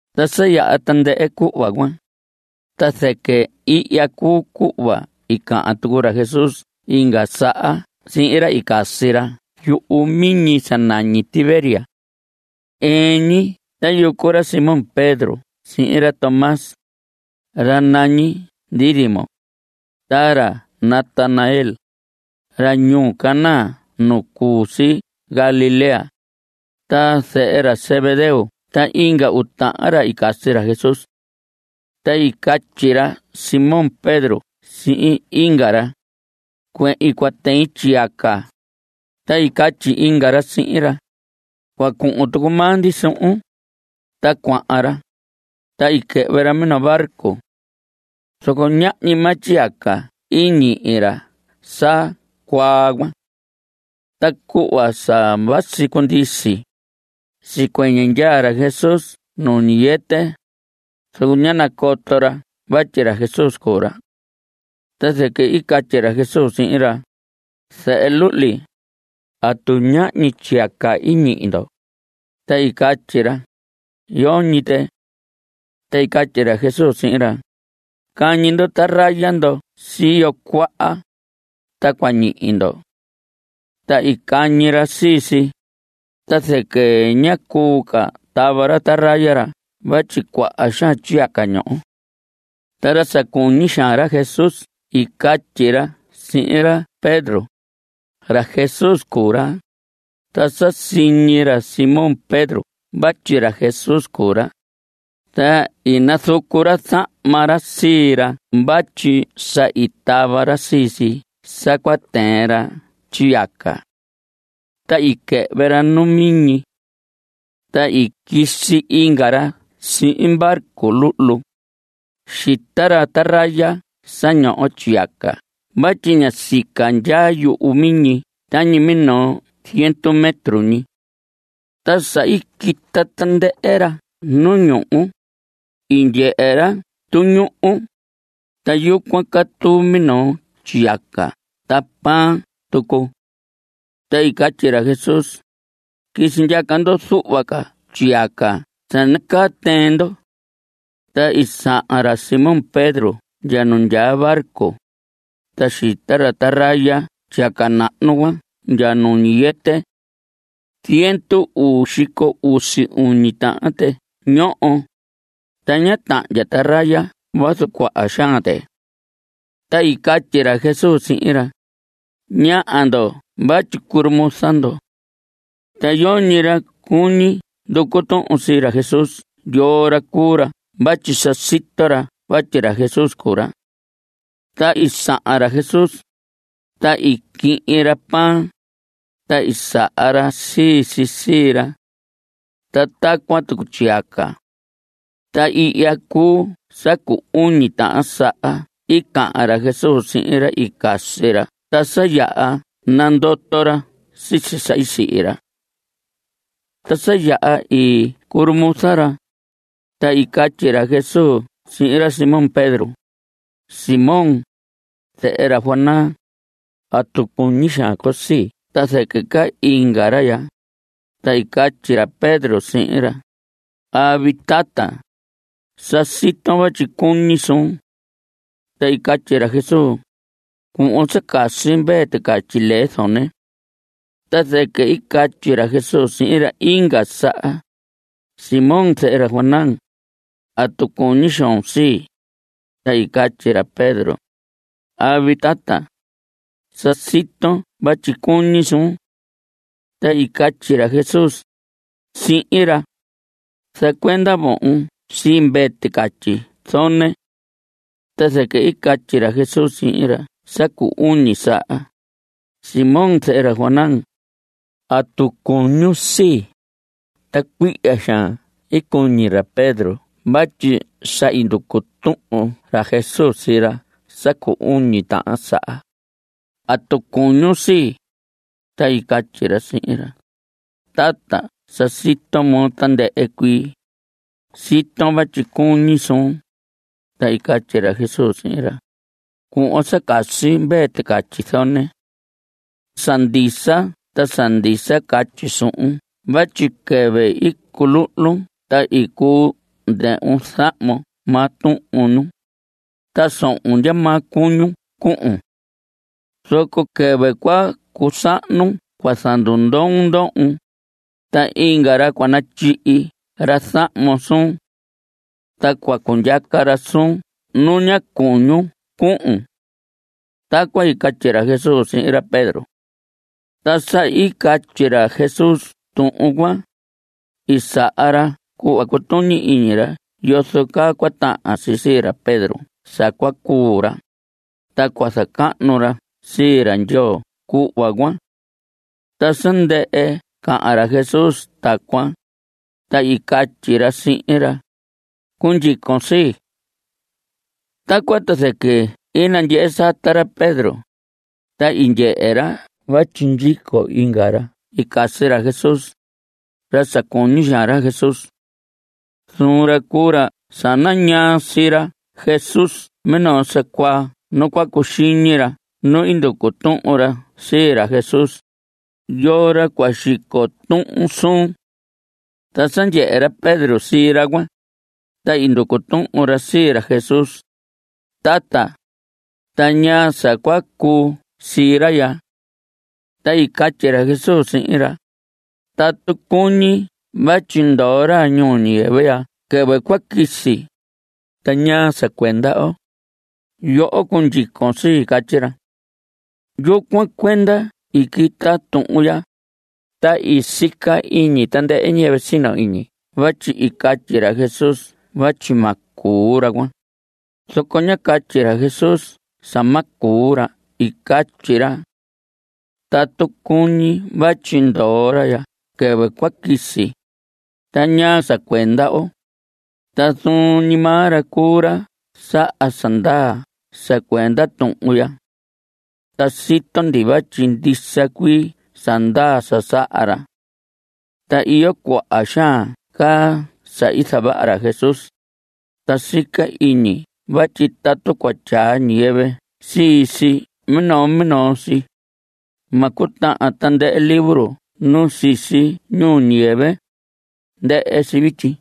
Ta sa yaha tandɨhɨ cuhva cuan, ta zɨquɨ ihya cuu cuhva i cahan tucu ra Jesús inga saha sihin ra i casi ra yumiñi sa nañi Tiberias. Ɨɨn ñi tayucu ra Simón Pedro sihin ra Tómas, ra nañi Dídimo, ta ra Natanael, ra ñuu Caná nu cu si Galilea, ta zehe ra Zebedeo ta inga uu tahan ra i casi ra Jesús. Ta i catyi ra Simón Pedro sihin inga ra: Cuehin cua tɨin tyiyaca. Ta i catyi inga ra sihin ra: Cua cuhun tucu maa ndi suhun. Ta cuahan ra, ta i quɨhvɨ ra minoo barco. Zoco ñahñi maa tyiyaca i ñihi ra sa cuaa cuan. Ta cuhva sa vasi cundisi, sicuɨñɨ ndyaa ra Jesús nu ñiyɨtɨ, zoco ñá nacoto ra vatyi ra Jesús cuu ra. Ta zɨquɨ i catyi ra Jesús sihin ra: Zehe luhli, ¿atu ñahñi tyiyaca i ñihi ndo? Ta i catyi ra: Yoñi tɨ. Ta i catyi ra Jesús sihin ra: Cañi ndo taraya ndo siyo cuaha, ta cua ñihi ndo. Ta i cañi ra sii si, ta zɨquɨ ñá cuu ca tava ra taraya ra vatyi cuaha xaan tyiyaca ñoho. Ta ra sa cuñi xaan ra Jesús i catyi ra sihin ra Pedro: Ra Jesús cuu ra. Ta sa siñi ra Simón Pedro vatyi ra Jesús cuu ra, ta i nazucu ra zahma ra sii ra vatyi sa i tava ra sii si sa cua tɨɨn ra tyiyaca. Ta i quɨhvɨ ra nu miñi. Ta i quisi inga ra sihin barco luhlu. Xita ra taraya sa ñoho tyiyaca vatyi ña sica ndyaa yuhu miñi tañi minoo ziendu metro ñi. Ta sa i quita tandɨhɨ ra nu ñuhu, i ndyehe ra tuñuhu, ta yucuan catuu minoo tyiyaca ta pan tucu. Ta i catyi ra Jesús: Quisi ndyaca ndo zuhva ca tyiyaca sa nacaa tɨɨn ndo. Ta i sahan ra Simón Pedro ndya nu ndyaa barco, ta xita ra taraya tyiyaca nahnu cuan ndya nu ñiyɨtɨ. Ziendu uu xico usi uñi tahan tɨ ñoho, ta ñá tahndya taraya vazu cuaha xaan tɨ. Ta i catyi ra Jesús sihin ra: Ñaha ndo vatyi curumuza ndo. Ta yoñi ra cuñi nducu tuhun sii ra Jesús yoo ra cuu ra vatyi sa sito ra vatyi ra Jesús cuu ra. Ta i sahan ra Jesús, ta i quihin ra pan, ta i saha ra sii si sii ra. Ta tacuan tucu tyiyaca. Ta ihya cuu sa cu uñi tahan saha i cahan ra Jesús sihin ra i casi ra ta sa yaha sa nandoto ra sisi sa i sihi ra. Ta sa yaha i curumuza ra, ta i catyi ra Jesús sihin ra Simón Pedro: Simón, zehe ra Jonás, ¿atu cuñi xaan con sii ta zɨquɨ ca inga ra ya? Ta i catyi ra Pedro sihin ra: Avi, tata, sa siton vatyi cuñi suun. Ta i catyi ra Jesús: Cuhvon sa casi mvee ticatyi lee zone. Ta zɨquɨ i catyi ra Jesús sihin ra inga saha: Simón, zehe ra Jonás, ¿atu cuñi xoon sii? Ta i catyi ra Pedro: Avi, tata, sa siton vatyi cuñi suun. Ta i catyi ra Jesús sihin ra: Zacuenda vohon sii mvee ticatyi zone. Ta zɨquɨ i catyi ra Jesús sihin ra sa cu uñi saha: Simón, zehe ra Jonás, ¿atu cuñun sii? Ta cuihya xaan i cuñi ra Pedro vatyi sa i nducu tuhun ra Jesús sii ra sa cu uñi tahan saha: ¿Atu cuñun sii? Ta i catyi ra sihin ra: Tata, sa sito moo tandɨhɨ cuii. Siton vatyi cuñi suun. Ta i catyi ra Jesús sihin ra: Cuhvon sa casi mvee ticatyi zone. Sa ndisa ta sa ndisa catyi suhun vatyi quɨvɨ i culuhlun ta i cuu ndɨhvun zahmon maa tuhun ñun, ta sohon ndyamaa cuñun cuhun. Zoco quɨvɨ cua cusahnun cua zandundoon ndohon, ta inga ra cua natyihi ra zahmon suun. Ta cua cundyaca ra suun nu ña cuñun cuhun. Tacuan i catyi ra Jesús sihin ra Pedro. Ta sa i catyi ra Jesús tuhun cuan, i saha ra cuhva cutuñi iñi ra yozo caa cua tahan si sii ra Pedro sa cua cuu ra, ta cua zacahnu ra sii ra Ndyoo cuhva cuan. Ta sa ndɨhɨ cahan ra Jesús tacuan, ta i catyi ra sihin ra: Cundyicon sii. Tacuan ta zɨquɨ i nandyehe sata ra Pedro, ta i ndyehe ra vatyi ndyico inga ra i casi ra Jesús, ra sa cuñi xaan ra Jesús. Zuun ra cuu ra sa nañaa sii ra Jesús minoo sa cuaa nu cua cuxiñi ra nu i nducu tuhun ra sii ra Jesús: ¿Yoo ra cua xico tuhun suun? Ta sa ndyehe ra Pedro sii ra cuan, ta i nducu tuhun ra sii ra Jesús: Tata, ¿ta ñaa sa cua cuu sii ra ya? Ta i catyi ra Jesús sihin ra: Tatu cuñi vatyi ndoo ra ñuu ñiyɨvɨ ndya quɨvɨ cua quisi ¿ta ñaa sa cuenda oo? Yoho cundyicon sii. Catyi ra. Yucuan cuenda i quita tuhun ya, ta i sica iñi tandɨhɨ ñiyɨvɨ sino iñi vatyi i catyi ra Jesús vatyi ma cuu ra cuan, zoco ñá catyi ra Jesús sa ma cuu ra. I catyi ra: “Tatu cuñi vatyi ndoo ra ndya quɨvɨ cua quisi ¿ta ñaa sa cuenda oo?” Ta zuun ñi maa ra cuu ra saha sa ndaa sa cuenda tuhun ya. Ta sito ndi vatyi ndisa cuii sa ndaa sa saha ra. Ta iyo cuaha xaan ca sa i zavaha ra Jesús. Ta sica iñi vatyi tatu cua tyaa ñiyɨvɨ sii si minoo minoo si, ma cutahan tandɨhɨ libro nu sisi ñuu ñiyɨvɨ. Ndɨhɨ si vityi.